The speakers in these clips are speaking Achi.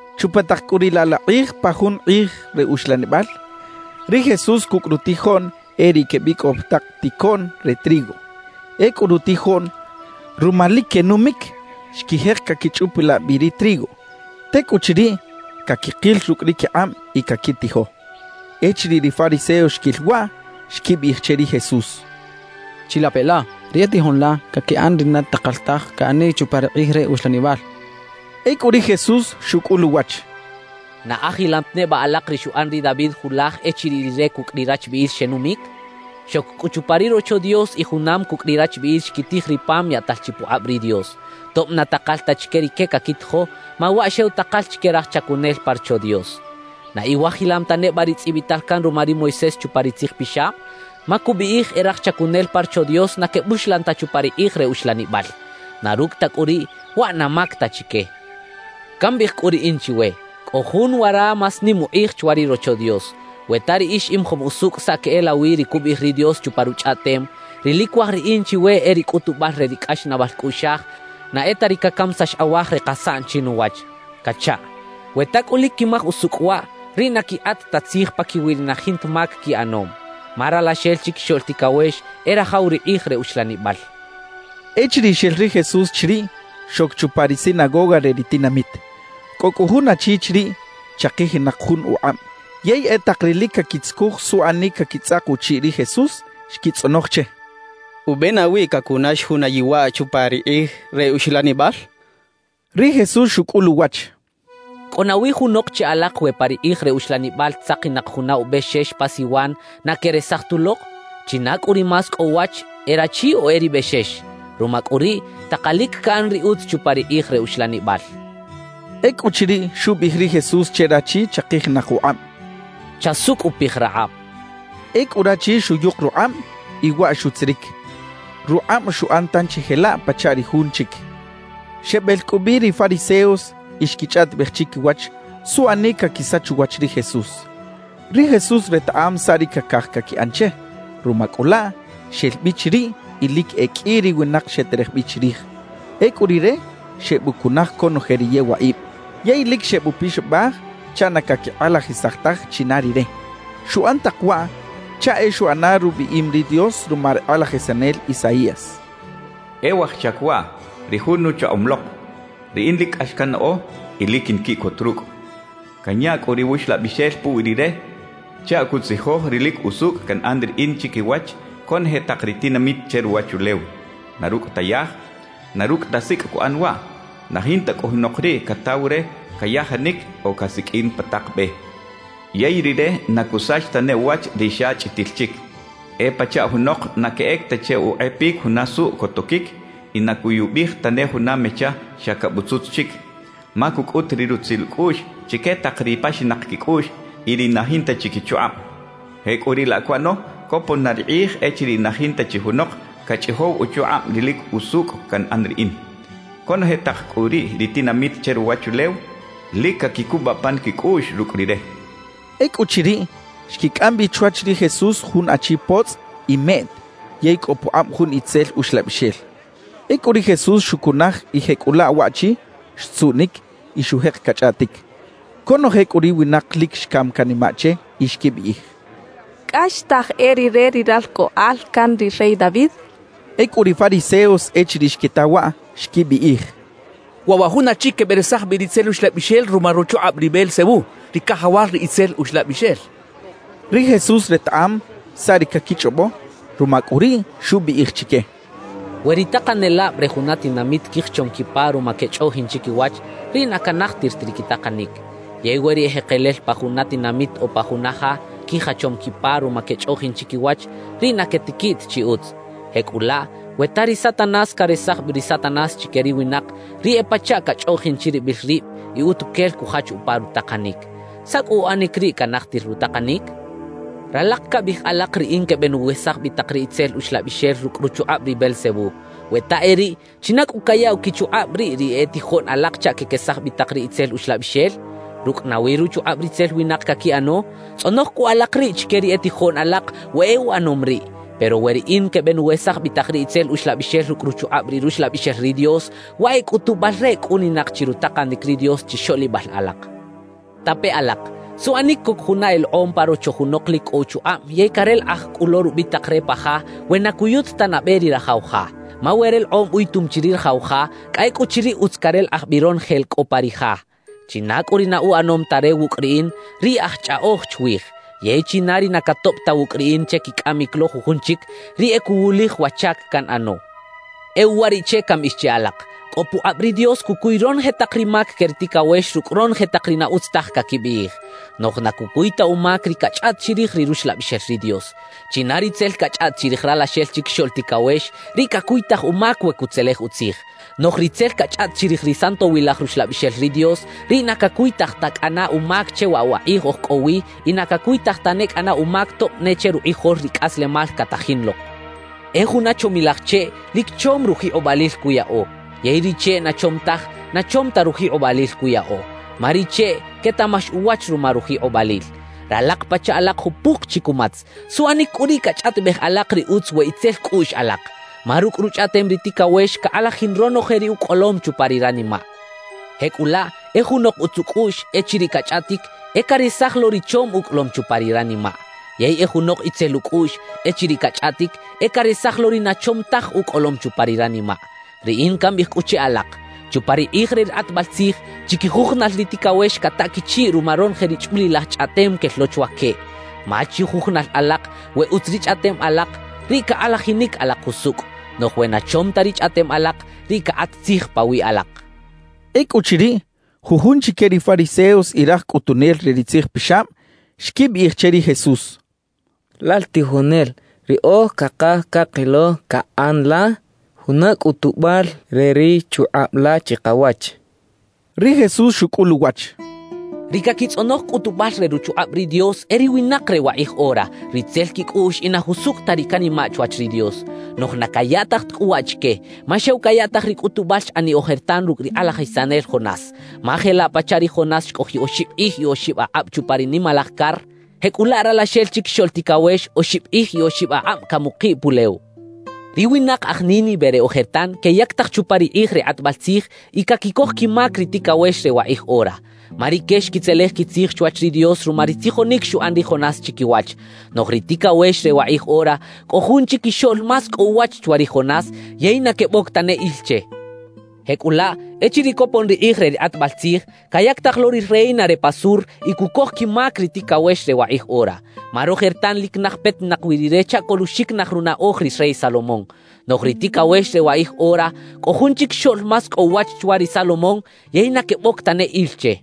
Chupa tak cꞌu riꞌ laꞌ la kꞌij pa jun kꞌij re uxlanibal, ri Jesús cucꞌ rutijoꞌn e riꞌ quebicꞌow pa tak ticoꞌn re trigo. Ecꞌu rutijoꞌn, ruma lic quenumic, xquijek caquichꞌupilaꞌ bi ri trigo; tecꞌuchiriꞌ, caquikil rucꞌ ri quikꞌab y caquitijo. Echiriꞌ ri fariseos xquil waꞌ, xquibiꞌij che ri Jesús: —Chilape la, ri e tijoꞌn la caquiꞌan ri na takal taj caꞌaniꞌ chupa ri kꞌij re uxlanibal —xechaꞌ. Ecꞌu ri Jesús xucꞌul uwach: —¿Na ajilam ta neba alak ri xuꞌan ri David julaj echiriꞌ rire cucꞌ ri rachbiꞌil xenumic? Xoc cꞌu chupa ri Rocho Dios y junam cucꞌ ri rachbiꞌil xquitij ri pam yaꞌtal chi pukꞌab ri Dios; tob na takal ta chique rique caquitijo, ma waꞌ xew takal chique raj chacunel pa Rocho Dios. »¿Na iwajilam ta neba ri tzꞌibital can ruma ri Moisés chupa ri Tzij Pixab? Ma cubiꞌij e raj chacunel pa Rocho Dios na quebuxlan ta chupa ri kꞌij re uxlanibal; na rucꞌ ta cꞌu riꞌ, waꞌ na mac ta chique. »Cambiꞌij cꞌu riꞌin chiwe: Cꞌo jun wara más nim ukꞌij chwa ri Rocho Dios. We ta riꞌix imajom usucꞌ saꞌ queꞌelawi ri cubiꞌij ri Dios chupa Ruchꞌaꞌtem: Ri lic cuaj Riꞌin chiwe e ri cꞌutubal re ri cꞌaxnaꞌbal cꞌuꞌxaj, na e ta ri cacamisax awaj re kasaꞌn chinuwach cachaꞌ; we ta cꞌu lic quimaj usucꞌ waꞌ, riꞌ na quikꞌat ta tzij paquiwi ri na jinta mac quiꞌanom. Ma Ralaxel Chiquixoꞌl Ticawex e rajaw ri kꞌij re uxlanibal —xchaꞌ. Echiriꞌ xel ri Jesús chiriꞌ, xoc chupa ri sinagoga re ri tinamit. Cꞌo cꞌu jun achi chiriꞌ chakijinak jun ukꞌab. Yey e tak ri lic caquitzucuj suꞌanic caquitzꞌak uchiꞌ ri Jesús, xquitzꞌonoj che: —¿Ube nawi cacunax juna yewaꞌ chupa ri kꞌij re uxlanibal? —xechaꞌ. Ri Jesús xucꞌul uwach: —¿Cꞌo nawi junok che alak we pa ri kꞌij re uxlanibal tzakinak juna ubexex pa siwan, na queꞌresaj tulok? ¿China cꞌu ri más cꞌo uwach, e rachi o e ri bexex? Ruma cꞌu riꞌ, takalic caꞌan ri utz chupa ri kꞌij re uxlanibal —xchaꞌ. Ecꞌuchiriꞌ, xubiꞌij ri Jesús che rachi chakijinak ukꞌab: —Chasucꞌupij rakꞌab —xchaꞌ. Ecꞌu rachi xuyuk rukꞌab y waꞌ xutziric, rukꞌab xuꞌan tanchi jelaꞌ pachaꞌ ri jun chic. Xebel cꞌu bi ri fariseos y xquichꞌaꞌtibej chiquiwach suꞌanic caquisach uwach ri Jesús. Ri Jesús retaꞌam saꞌ ri cacaj caquiꞌan che; ruma cꞌu laꞌ, xel bi chiriꞌ y lic e qꞌui ri winak xeterej bi chirij. Ecꞌu Rire xebucunaj conoje ri yewaꞌib yey lic xebupixabaj chaꞌ na caquikꞌalajisaj taj china Rire. Xuꞌan tak waꞌ chaꞌ e xuꞌana rubiꞌim ri Dios ruma ri kꞌalajisanel Isaías: E waj chac waꞌ, ri Jun nuchaꞌom lok. Riꞌin lic cꞌax cannaꞌo y lic quinquiꞌcot rucꞌ. Canya cꞌu ri Wuxlabixel puwi Rire chaꞌ cutzijoj ri lic usucꞌ canꞌan Riꞌin chiquiwach conoje tak ri tinamit che ruwachulew. Na rucꞌ ta yaj, na rucꞌ ta sicꞌ cuꞌan waꞌ; Na jinta cꞌu junok riꞌ cataw re cayajanic o casiqꞌuin pa tak be. Yey Rire na cusach tane uwach ri xa chꞌitil chic. E pachaꞌ junok na queꞌec ta che ukꞌepic juna suꞌ cotoquic y na cuyubij tane juna mecha xa cabutzutz chic; ma cucꞌut ri rutzil ucꞌuꞌx chique tak ri paxinak quicꞌuꞌx y ri na jinta chi quichukꞌab. Jecꞌuriꞌlaꞌ cuꞌano copon na ri kꞌij echiriꞌ na jinta chi junok cachꞌijow uchukꞌab ri lic usucꞌ canꞌan Riꞌin. Conoje tak cꞌu riꞌ ri tinamit che ruwachulew lic caquicubaꞌ pan quicꞌuꞌx rucꞌ Rire xchaꞌ. Ecꞌuchiriꞌ, xquicꞌam bi chwach ri Jesús jun achi potzꞌ y meꞌt yey cꞌo pukꞌab jun itzel uxlabixel. Ecꞌu ri Jesús xucunaj y jecꞌulaꞌ waꞌchi xtzuꞌnic y xujek cachꞌaꞌtic. Conoje cꞌu ri winak lic xcam canimaꞌ che y xquibiꞌij: «¿Cꞌaxtaj e rire ri Ralcꞌoꞌal can ri rey David?» xechaꞌ. Ecꞌu ri fariseos echiriꞌ xquita waꞌ, xquibiꞌij: «Waꞌ wa jun achi queberesaj bi ri itzel uxlabixel ruma ruchukꞌab ri Beelzebú, ri cajawal ri itzel uxlabixel» xechaꞌ. Ri Jesús retaꞌam saꞌ ri caquichꞌobo; ruma cꞌu riꞌ, xubiꞌij chique: «We ri takanelab re juna tinamit quijachom quipa ruma quechꞌoꞌjin chiquiwach, riꞌ na canajtir ta ri quitakanic. Yey we ri ejekelel pa juna tinamit o pa juna ja quijachom quipa ruma quechꞌoꞌjin chiquiwach, riꞌ na quetiquiꞌ ta chi utz. Jecꞌulaꞌ, we ta ri Satanás caresaj bi ri Satanás chique ri winak, riꞌ e pachaꞌ cachꞌoꞌjin chiribil rib y utuquel cujach upa rutakanic. ¿Saꞌ cꞌu uꞌanic riꞌ canajtir rutakanic? »Ralak cabiꞌij alak riꞌin quebenuwesaj bi tak ri itzel uxlabixel rucꞌ ruchukꞌab ri Beelzebú. We ta e riꞌ, ¿china cꞌu cayaꞌw quichukꞌab riꞌ ri e tijoꞌn alak chaꞌ quequesaj bi tak ri itzel uxlabixel? ¿Rucꞌ nawi ruchukꞌab ritzel winak caquiꞌano? Tzꞌonoj cꞌu alak riꞌ chique ri e tijoꞌn alak we e uꞌanom riꞌ. Pero we riꞌin quebenuwesaj bi tak ri itzel uxlabixel rucꞌ ruchukꞌab ri Ruxlabixel ri Dios, waꞌ e cꞌutubal re cꞌuninak chi rutakanic ri Dios chixoꞌlibal alak. »Tape alak: ¿Suꞌanic coc juna elekꞌom pa rocho junok lic cꞌo uchukꞌab yey carelekꞌaj cꞌu lo rubitak re pa ja, we na cuyut ta nabe ri rajaw ja? Ma we relekꞌom uyutum chi ri rajaw ja, cꞌa ecꞌuchiriꞌ utz carelekꞌaj bi ronoje la cꞌo pa ri ja. »China cꞌu ri na uꞌanom ta re wucꞌ riꞌin, riꞌ aj chꞌaꞌoj chwij. Yey china ri na catoꞌb ta wucꞌ riꞌin che quicꞌamic lo jujun chic, riꞌ e cuwulij wa chac canꞌano. »E uwariꞌche cambiꞌij che alak: Cꞌo pukꞌab ri Dios cucuy ronoje tak ri mac que ri ticawex rucꞌ ronoje tak ri na utz taj caquibiꞌij, noꞌj na cucuy ta umac ri cachꞌaꞌt chirij ri Ruxlabixel ri Dios. China ri tzel cachꞌaꞌt chirij Ralaxel Chiquixoꞌl Ticawex, riꞌ cacuytaj umac we cutzelej utzij. Noꞌj ri tzel cachꞌaꞌt chirij ri Santowilaj Ruxlabixel ri Dios, riꞌ na cacuytaj ta cꞌana umac che waꞌ wa kꞌij oj cꞌo wi y na cacuytaj tane cꞌana umac tob ne che rukꞌijol ri cꞌaslemal catajin lok. »E juna chomilaj cheꞌ, lic chom rujikꞌobalil cuyaꞌo; yey ri cheꞌ na chom taj, na chom ta rujikꞌobalil cuyaꞌo. Ma ri cheꞌ quetaꞌmax uwach ruma rujikꞌobalil. ¡Ralak pachaꞌ alak jupuk chi cumatz! ¿Suꞌanic cꞌu riꞌ cachꞌaꞌtibej alak ri utz we itzel cꞌuꞌx alak? Ma rucꞌ ruchꞌaꞌtem ri ticawex cakꞌalajin ronoje ri ucꞌolom chupa ri ranimaꞌ. Jecꞌulaꞌ e junok utz ucꞌuꞌx, echiriꞌ cachꞌaꞌtic, e caresaj lo ri chom ucꞌolom chupa ri ranimaꞌ. Yey e junok itzel ucꞌuꞌx, echiriꞌ cachꞌaꞌtic, e caresaj lo ri na chom taj ucꞌolom chupa ri ranimaꞌ. »Riꞌin cambiꞌij cꞌu che alak: Chupa ri kꞌij re ri kꞌatbal tzij, chiquijujunal ri ticawex cataꞌ quichiꞌ ruma ronoje ri chꞌulilaj chꞌaꞌtem quel lo chwa queꞌ. Ma chijujunal alak, we utz ri chꞌaꞌtem alak, riꞌ cakꞌalajinic alak jusucꞌ; noꞌj we na chom ta ri chꞌaꞌtem alak, riꞌ cakꞌat tzij pawiꞌ alak» xchaꞌ. Ecꞌuchiriꞌ, jujun chique ri fariseos y raj cꞌutunel re ri tzijpixab, xquibiꞌij che ri Jesús: —Lal tijonel, riꞌoj cakaj cakilo caꞌan la juna cꞌutubal re ri chukꞌab la chikawach —xechaꞌ. Ri Jesús xucꞌul uwach: —Ri caquitzꞌonoj cꞌutubal re ruchukꞌab ri Dios e ri winak re wakꞌij ora, ri itzel quicꞌuꞌx y na jusucꞌ ta ri canimaꞌ chwach ri Dios. Noꞌj na cayaꞌtaj ta cꞌu waꞌ chique, ma xew cayaꞌtaj ri cꞌutubal xꞌaniꞌ ojertan rucꞌ ri kꞌalajisanel Jonás. Ma jelaꞌ pachaꞌ ri Jonás xcꞌojiꞌ oxib kꞌij y oxib akꞌab chupa ri nimalaj car, jecꞌulaꞌ Ralaxel Chiquixoꞌl Ticawex oxib kꞌij y oxib akꞌab camukiꞌ pulew. »Ri winak aj Nínive re ojertan queyactaj chupa ri kꞌij re kꞌatbal tzij y caquicoj quimac ri ticawex re wakꞌij ora. Ma rique xquitzelej quitzij chwach ri Dios ruma ri tzijonic xuꞌan ri Jonás chiquiwach. Noꞌj ri ticawex re wakꞌij ora, cꞌo jun chiquixoꞌl más cꞌo uwach chwa ri Jonás, yey na queboc tane il che. »Jecꞌulaꞌ echiriꞌ copon ri kꞌij re ri kꞌatbal tzij, cayactaj lo ri reina re pa sur y cucoj quimac ri ticawex re wakꞌij ora. Ma rojertan lic naj petinak wi rire chaꞌ coluꞌxiquinaj runaꞌoj ri rey Salomón. Noꞌj ri ticawex re wakꞌij ora, cꞌo jun chiquixoꞌl más cꞌo uwach chwa ri Salomón, yey na queboc tane il che.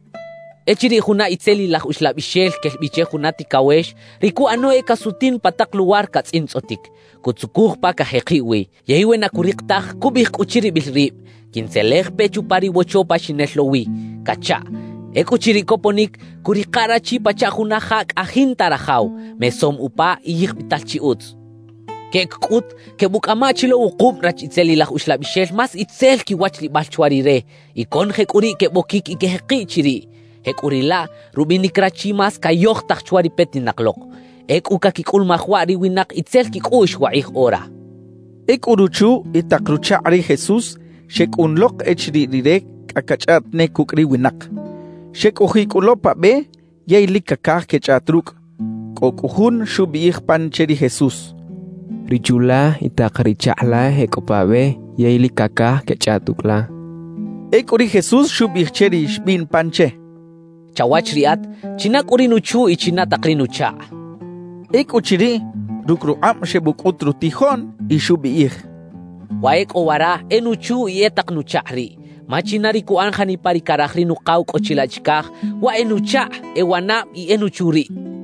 »Echiriꞌ juna itzelilaj uxlabixel quel bi che juna ticawex, ri cuꞌano e casutin pa tak luwar catzꞌintzꞌotic, cutzucuj pa cajekiꞌ wi. Yey we na curik taj, cubiꞌij cꞌu chiribil rib: “Quintzelej pe chupa ri wocho pa xinel lo wi” cachaꞌ. Ecꞌuchiriꞌ coponic, cuꞌrika rachi pachaꞌ juna ja cꞌa jinta rajaw, mesom upa y yijbital chi utz. Queꞌec cꞌut, quebuꞌcꞌama chi lo wukub rach itzelilaj uxlabixel más itzel quiwachlibal chwa rire; y conoje cꞌu riꞌ queboquic y quejekiꞌ chiriꞌ. Jecꞌuriꞌlaꞌ, rubinic rachi más cayojtaj chwa ri petinak lok. Ecꞌu caquicꞌulumaj waꞌ ri winak itzel quicꞌuꞌx wakꞌij ora —xcha ri Jesús. Ecꞌu ruchu y tak ruchakꞌ ri Jesús xecꞌun lok echiriꞌ Rire cꞌa cachꞌaꞌt ne cucꞌ ri winak. Xecꞌojiꞌ cꞌu lo pa be yey lic cacaj quechꞌaꞌt rucꞌ. Cꞌo cꞌu jun xubiꞌij pan che ri Jesús: —Ri chu la y tak ri chakꞌ la e cꞌo pa be yey lic cacaj quechꞌaꞌt ucꞌ la —xchaꞌ. Ecꞌu ri Jesús xubiꞌij che ri xbiꞌn pan che: —Chawach riꞌat, ¿china cꞌu ri nuchu y china tak ri nuchakꞌ? —xchaꞌ. Ecꞌuchiriꞌ, rucꞌ rukꞌab xebucꞌut rutijoꞌn y xubiꞌij: —Wa e cꞌo wara e nuchu y e tak nuchakꞌ riꞌ. Ma china ri cuꞌan janipa ri caraj ri Nukaw cꞌo chilaꞌ chicaj, waꞌ e nuchakꞌ, e wanab y e nuchu riꞌ —xchaꞌ.